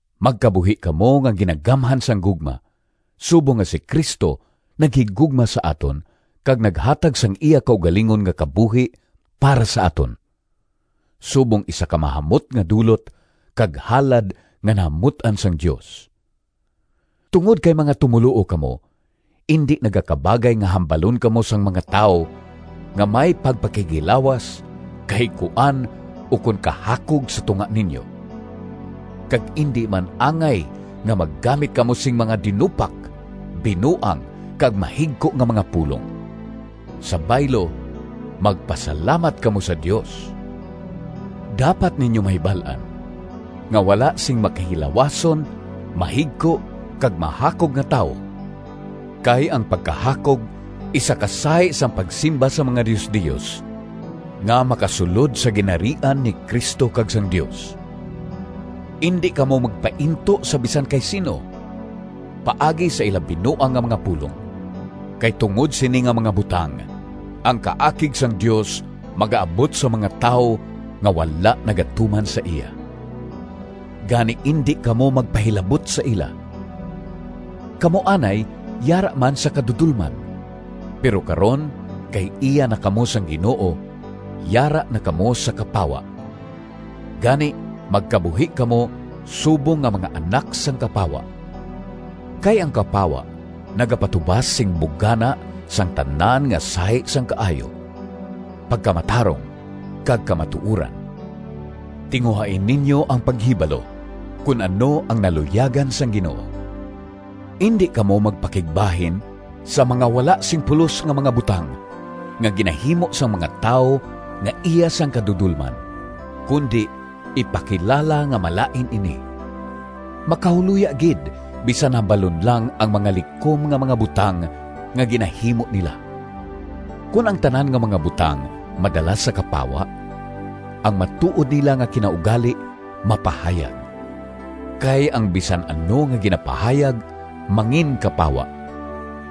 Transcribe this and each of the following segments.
Magkabuhi kamo nga ginagamhan sang gugma, subong nga si Cristo naghigugma sa aton kag naghatag sang iya kaugalingon nga kabuhi para sa aton, subong isa ka mahamot nga dulot kag halad nga nahamut-an sang Dios. Tungod kay mga tumoluo kamo, indi nagakabagay nga hambalon kamo sang mga tawo nga may pagpakighilawas, kahigkuan, ukon kahakog sa tunga ninyo. Kag indi man angay nga maggamit kamo sing mga dinupak, binuang kag mahigko nga mga pulong. Sa baylo, magpasalamat kamo sa Dios. Dapat ninyo mahibal-an nga wala sing makihilawason, mahigko, kag mahakog nga tawo (kay ang pagkahakog isa ka sahi sang pagsimba sa mga diosdios) nga makasulod sa Ginharian ni Cristo kag sang Dios. Indi kamo magpainto sa bisan kay sin-o paagi sa ila binuang nga mga pulong; kay tungod sini nga mga butang ang kaakig sang Dios magaabot sa mga tawo nga wala nagatuman sa iya. Gani indi kamo magpahilabot sa ila. Kamo anay yara man sa kadudolman, pero karon kay iya na kamo sang Ginoo yara na kamo sa kapawa. Gani magkabuhi kamo subong nga mga anak sang kapawa. Kay ang kapawa nagapatubas sing bugana sang tanan nga sahi sang kaayo, pagkamatarong, kag kamatuoran. Tinguhai ninyo ang paghibalo kon ano ang naluyagan sang Ginoo. Indi kamo magpakigbahin sa mga wala sing pulos nga mga butang nga ginahimo sang mga tawo nga iya sang kadudolman, kundi ipakilala nga malain ini. Makahuloya gid bisan hambalon lang ang mga likom nga mga butang nga ginahimo nila. Kon ang tanan nga mga butang madala sa kapawa, ang matuod nila nga kinaugali mapahayag. Kay ang bisan ano nga ginapahayag manginkapawa.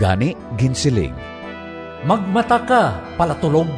Gani ginsiling: “Magmata ka, palatulog,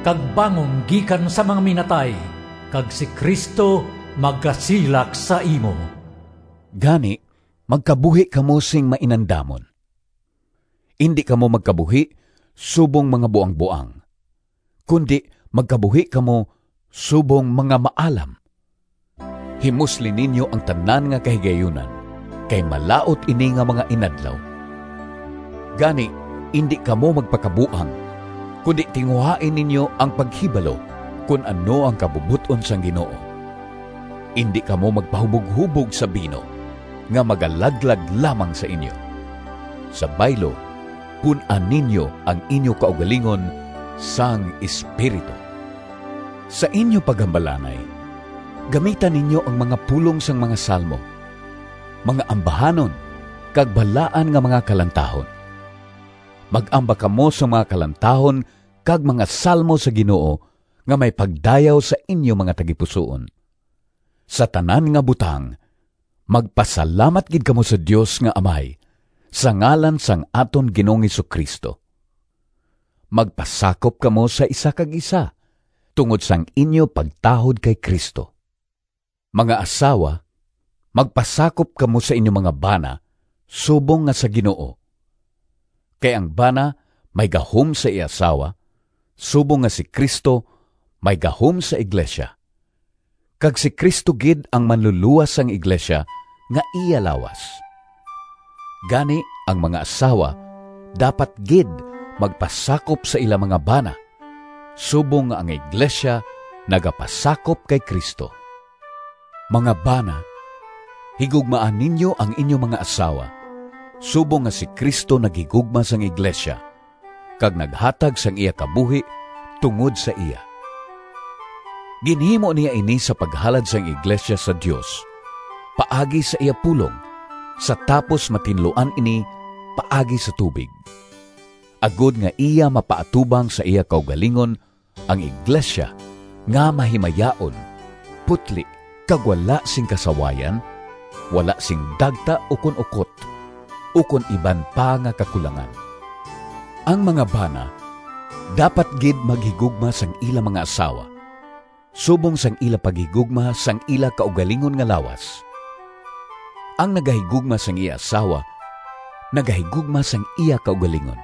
Kag bangon gikan sa mga minatay! Kag si Cristo magasilak sa imo.” Gani magkabuhi kamo sing mainandamon. Indi kamo magkabuhi subong mga buangboang, kundi magkabuhi kamo subong mga maalam. Himusli ninyo ang tanan nga kahigayunan, kay malaut ini nga mga inadlaw. Gani indi kamo magpakabuang, kundi tinguhai ninyo ang paghibalo kon ano ang kabubot-on sang Ginoo. Indi kamo magpahuboghubog sa bino nga magalaglag lamang sa inyo. Sa baylo, pun-a ninyo ang inyo kaugalingon sang Espiritu. Sa inyo paghambalanay gamita ninyo ang mga pulong sang mga salmo, mga ambahanon, kag balaan nga mga kalantahon. Mag-amba kamo sang mga kalantahon kag mga salmo sa Ginoo nga may pagdayaw sa inyo mga tagipusoon. Sa tanan nga butang magpasalamat gid kamo sa Dios nga Amay, sa ngalan sang aton Ginoong Jesu-Cristo. Magpasakop kamo sa isa kag isa, tungod sang inyo pagtahod kay Cristo. Mga asawa, magpasakop kamo sa inyo mga bana, subong nga sa Ginoo. Kay ang bana may gahom sa iya asawa, subong nga si Cristo may gahom sa iglesia, kag si Cristo gid ang Manlulowas sang iglesia nga iya lawas. Gani ang mga asawa dapat gid magpasakop sa ila mga bana, subong nga ang iglesia nagapasakop kay Cristo. Mga bana, higugmaa ninyo ang inyo mga asawa, subong nga si Cristo naghigugma sang iglesia kag naghatag sang iya kabuhi tungod sa iya. Ginhimo niya ini sa paghalad sang iglesia sa Dios paagi sa iya pulong, sa tapos matinluan ini paagi sa tubig, agod nga iya mapaatubang sa iya kaugalingon ang iglesia nga mahimayaon, putli kag wala sing kasawayan, wala sing dagta ukon ukot, ukon iban pa nga kakulangan. Ang mga bana dapat gid maghigugma sang ila mga asawa, subong sang ila paghigugma sang ila kaugalingon nga lawas. Ang nagahigugma sang iya asawa nagahigugma sang iya kaugalingon.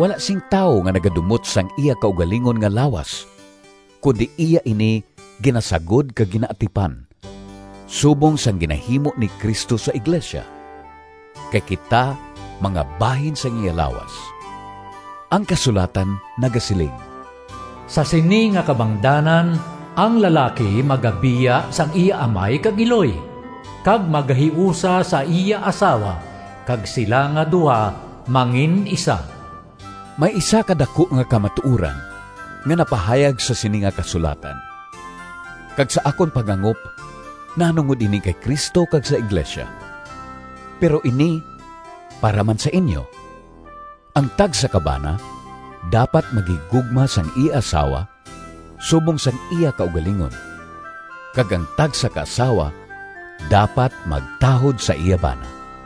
Wala sing tawo nga nagadumot sang iya kaugalingon nga lawas, kundi iya ini ginasagod kag ginaatipan, subong sang ginahimo ni Cristo sa iglesia, kay kita mga bahin sang iya lawas. Ang kasulatan nagasiling, “Sa sini nga kabangdanan, ang lalaki magabiya sang iya amay kag iloy, kag magahiusa sa iya asawa, kag sila nga duha mangin-isa.” May isa ka daku nga kamatuoran nga napahayag sa sini nga kasulatan, kag sa akon paghangop nahanungod ini kay Cristo kag sa iglesia. Pero ini para man sa inyo: ang tagsa ka bana dapat maghigugma sang iya asawa subong sang iya kaugalingon, kag ang tagsa ka asawa dapat magtahod sa iya bana.